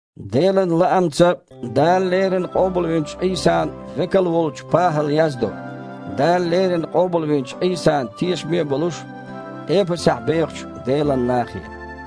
Делан лаамца Дала леррина къобалвинчу Іийсан векал волчу ПахІала яздо, Дала леррина къобалвинчу Іийсана тешаме а болуш, Эпасехь бехачу Делан нахе.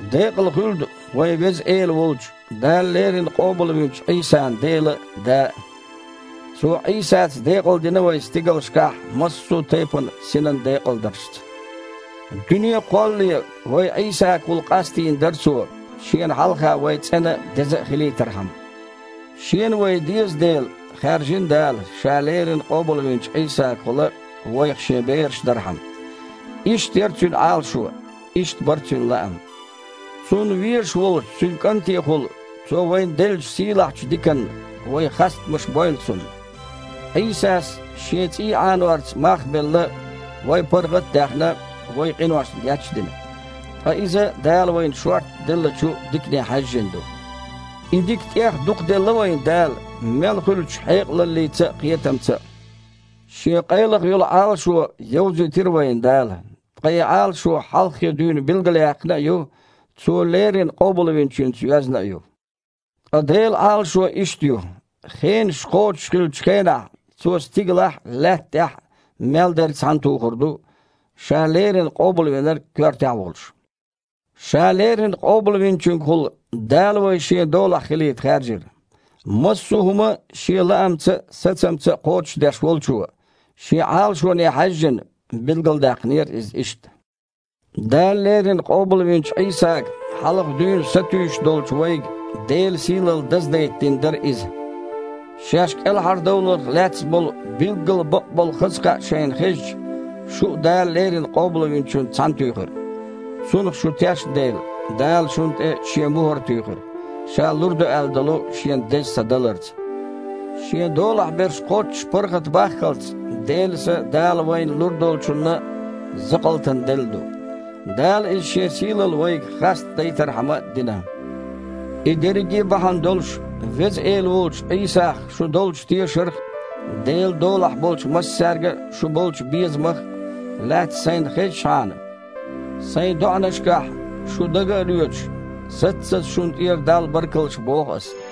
Декъала хуьлда вайн Веза Эла волчу, Дала леррина къобалвинчу Іийсан Дела а, Да а. Цо Іийсаца декъалдина вай стигалшкахь массо а тайпана синан декъалдаршца. Дуьне а кхоллале, вай Іийсагахула къастийна дара Цо, Шена хьалха вай цІена а, деза а хилийтархьама. Шена вай деза дела, хаьржина Дала, Ша леррина къобалвинчу Іийсагахула вайх Шен бераш дархьама. Иштта яра Цуьнан Іалашо, иштта бара Цуьнан лаам. Цунна везаш волчу Цуьнан КІантехула Цо вайна деллачу сийлахьчу диканна вай хастамаш бойла Цунна. Іийсас, Шен цІий Іанорца мах а белла, вай паргІат а даьхна, вайн къиношна геч а дина. Ткъа иза Дала вайна шортта деллачу дикане хьаьжжина ду. И дика тІех дукха делла вайна Дала мел хуьлучу хьекъалаллица а, кхетамца а. Шен къайлаха йолу Іалашо йовзийтира вайна Дала, ткъа и Іалашо хьалххе дуьйна билгалъяьккхина а ю, Цо леррина Къобалвинчуьнца йоьзна а ю. Ткъа Делан Іалашо иштта ю: хенаш кхочуш хиллачу хенахь Цо стигалахь а, лаьтта тІехь а мел дерг цхьаьнатухур ду, Ша леррина Къобалвинарг коьртехь а волуш. Ша леррина Къобалвинчуьнгахула Дала вай Шен долахь хилийта хаьржира. Массо а хІума Шен лаамца а, сацамца а кхочушдеш Волчо, Шен Іалашоне хьаьжжина, билгалдаьккхинера иза иштта. Дала леррина къобалвинчу Іийсага хьалха дуьйна сатуьйсуш долчу вайга Делан сийлалла даздайта дина дара иза. Шаьш кІелхьардовларх лаьцна болу билггал бакъболу хаза кхаъ шайна хезча, шу а Дала леррина Къобалвинчуьнца цхьаьнатуьйхира. Цунах шу тешна дела, Дала шуна тІе Шен мухІар туьйхира, Ша лур ду аьлла долу Шен Деза Са даларца. Шен долахь берш кхоччуш паргІатбаххалц, Делан Са Дала вайна лур долчунна закъалтана делла ду. Дала иза Шен сийлалла вайга хастадайтархьама дина. И дерриге а бахьана долуш, Веза Эла волчу Іийсах шун долчу тешарх а, Делан долахь болчу массаьрга а шун болчу безамах а лаьцна сайна хезначхьана, сайн доІанашкахь, шу дага а лоьцуш, саццаза шуна тІера Далла баркаллаш боху аса.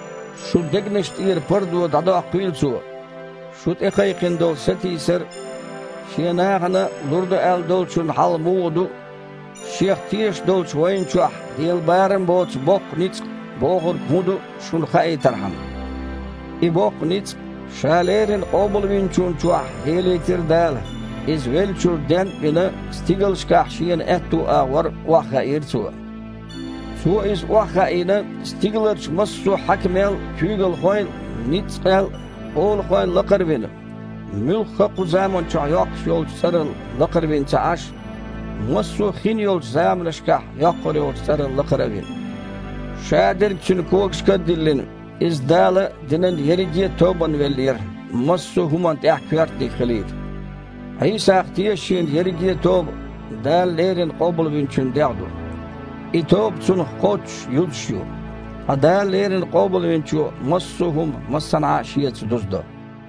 Шун дегнашна тІера пардо дІадоккхийла Цо, шу тІекхайкхина долу сатийсар а, Шен нахана лур ду аьлла долчун хьал муха ду а, Шех тешаш долчу вайна чохь лела барам боцу боккха ницкъ бохург хІун ду а шуна хаийтархьама. И боккха ницкъ Ша леррина Къобалвинчунна чохь лелийтира Дала. Иза, веллачуьра ден а вина, стигалшкахь Шена аьтту агІор охьахаийра Цо. Цо Иза охьахаийна, стигаларчу массо а хьаькамел а, куьйгалхойл а, ницкъел а, олахойл а лакхара а вина, муьлхха а кху заманчохь йоккхуш йолчу цІарал лакхара вина ца Іаш, массо а хин йолчу заманашкахь йоккхур йолчу цІарал лакхара а вина. Шадерг Цуьнан когашка а диллина, Иза Дала динан ерриге а тобанна веллера, массо а хІуманна тІехь коьртаниг хилийта. Іийсах тешачийн ерриге а тоба – Дала леррина Къобалвинчун дегІ ду. И тоба Цунах кхоччуш юзуш ю. Ткъа Дала леррина Къобалвинчо массо а хІума массанхьа а Шеца дузадо.